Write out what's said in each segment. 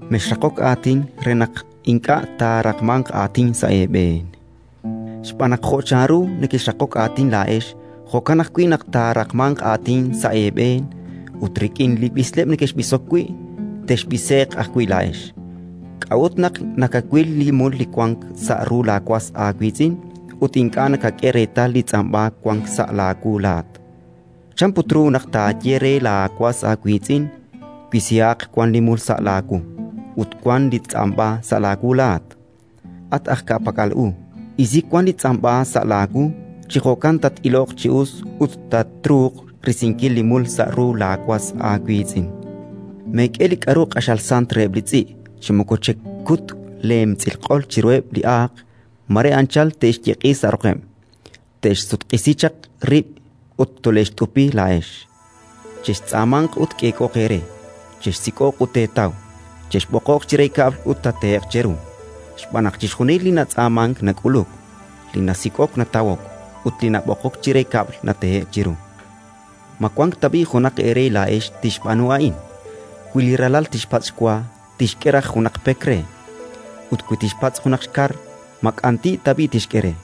“Mexraqok aatin re naq ink'a' taaraqmanq aatin sa' eeb'een. Xb'aan naq jo' chanru nekexraqok aatin laa'ex, jo'kan ajwi' naq taaraqmanq aatin sa' eeb'een; ut rik'in li b'isleb' nekexb'isok wi', texb'ise'q ajwi' laa'ex. “K'a'ut naq nakawil li mul li wank sa' ru laawas aawiitz'in ut ink'a' nakak'e reetal li tz'amb'a wank sa' laawu laa'at? Chan put ru naq taaye re laawas aawiitz'in: «Wisihaq wan li mul sa' laawu», ut wank li tz'amb'a sa' laawu laa'at? At aj ka'pak'al u, isi wan li tz'amb'a sa' laawu; chi jo'kan tat-iloq chi us ut tatruuq risinkil li mul sa' ru laawas aawiitz'in. “Meek'e li k'aru q'axal sant reheb' li tz'i', chi moko chekut leelemtz'il q'ol chiruheb' li aaq: mare anchal te'xyeq'i sa' roqeb', te'xsutq'isi chaq rib' ut tole'xt'upi laa'ex. “Chextz'aamanq ut k'eek'ooq eere; chexsik'oq ut teetaw; chexb'oqoq chire kab'l ut tehe'q cheru. Xb'aan naq chixjunil li natz'aamank nak'uluk; li nasik'ok natawok, ut li nab'oqok chire kab'l natehe'k chiru. “Ma wank tab'i' junaq eere laa'ex tixb'aanu a'in: wi li ralal tixpatz' xwa, tixk'e raj junaq pek re; ut wi tixpatz' junaq xkar, ma k'anti' tab'i' tixk'e re?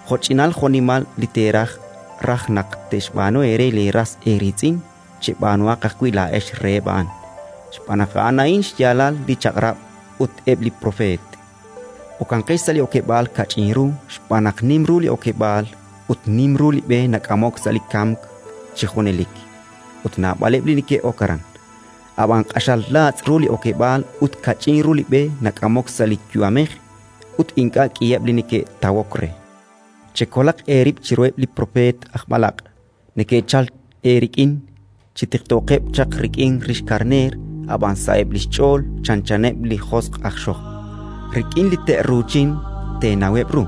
“Jo'ch'inal jo'nimal li teeraj raj naq te'xb'aanu eere leeras eeriitz'in, cheb'aanuhaq ajwi' laa'ex reheb' a'an, xb'aan naq a'an a'in xyaalal li Chaq'rab' ut eb' li Propeet. “Okanqex sa' li okeb'aal kach'in ru xb'aan naq nim ru li okeb'aal ut nim ru li b'e nak'amok sa' li kamk chi junelik, ut naab'aleb' li neke'ok aran. Ab'an q'axal laatz' ru li okeb'aal ut kach'in ru li b'e nak'amok sa' li yu'amej, ut ink'a' k'iheb' li neke'tawok re. Eb' li propeet aj b'alaq' “Chekolaq eerib' chiruheb' li propeet aj b'alaq': neke'chalk eerik'in chi tiqtookeb' chaq rik'in rix karneer, ab'an sa'eb' li xch'ool chanchaneb' li josq' aj xojb'. Rik'in li te'ruuchin teenaweb' ru.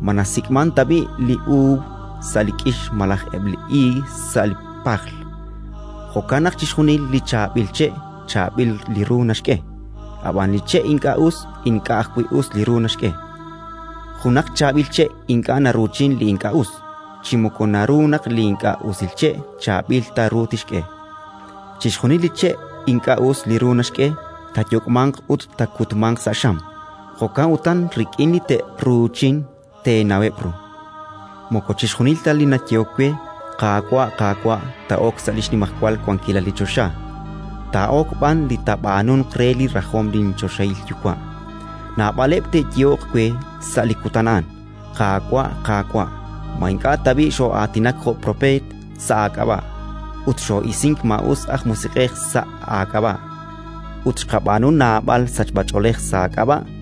Ma nasik'mank tab'i' li uub' sa' li k'ix malaj eb' li iig sa' li pajl? Jo'kan naq chixjunil li chaab'il che' chaab'il li ru naxk'e, ab'an li che' ink'a' us ink'a' ajwi' us li ru naxk'e. Junaq chaab'il che' ink'a' naruuchin li ink'a' us, chi moko naru naq li ink'a' usil che' chaab'il ta li ru tixk'e. Chixjunil li che' ink'a' us li ru naxk'e, taayok'manq ut taakutmanq sa' xam. Jo'kan utan rik'in li te'ruuchin teenaweb' ru. “Moko chixjunil ta li nayehok we: «Qaawa', Qaawa'», taa'ok sa' li xnimajwal wankilal li choxa, taa'ok b'an li taab'aanunq re li rajom linchoxahil Yuwa'. Naab'aleb' te'yehoq we sa' li kutan a'an: «Qaawa', Qaawa', ma ink'a' tab'i' xoo'aatinak jo' propeet sa' aak'ab'a', ut xoo'isink maa'us aj musiq'ej sa' aak'ab'a', ut xqab'aanu naab'al sachb'ach'oolej sa' aak'ab'a'?».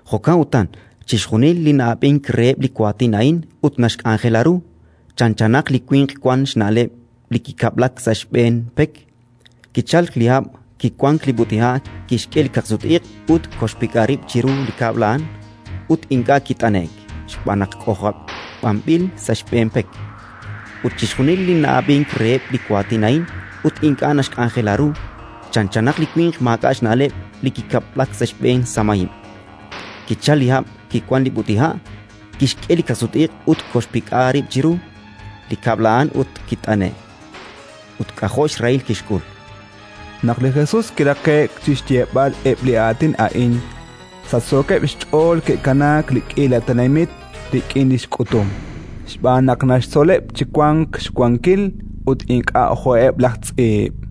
“Jo'kan utan, chixjunil li na'ab'ink reheb' li waatin a'in ut naxk'anjela ru, chanchanaq li winq wank xna'leb' li kikab'lak sa' xb'een pek. Kichalk li hab', kiwank li b'ut'iha', kixk'e li kaqsut-iq' ut koxe'xpik'a rib' chiru li kab'l a'an, ut ink'a' kit'ane'k xb'aan naq k'ojob'anb'il sa' xb'een pek. Ut chixjunil li na'ab'ink reheb' li waatin a'in ut ink'a' naxk'anjela ru, chanchanaq li winq maak'a' xna'leb' li kikab'lak sa' xb'een samahib'. Kichalk li hab', kiwank li b'ut'iha', kixk'e li kaqsut-iq' ut koxe'xpik'a rib' chiru li kab'l a'an ut kit'ane'k, ut k'ajo' xrahil kixk'ul”. Naq li Jesus kiraqe'k chi xyeeb'al eb' li aatin a'in, sachsookeb' xch'ool ke'kanaak li k'iila tenamit rik'in li xk'utum, xb'aan naq naxtzoleb' chi wank xwankil, ut ink'a' jo'eb' laj tz'iib'.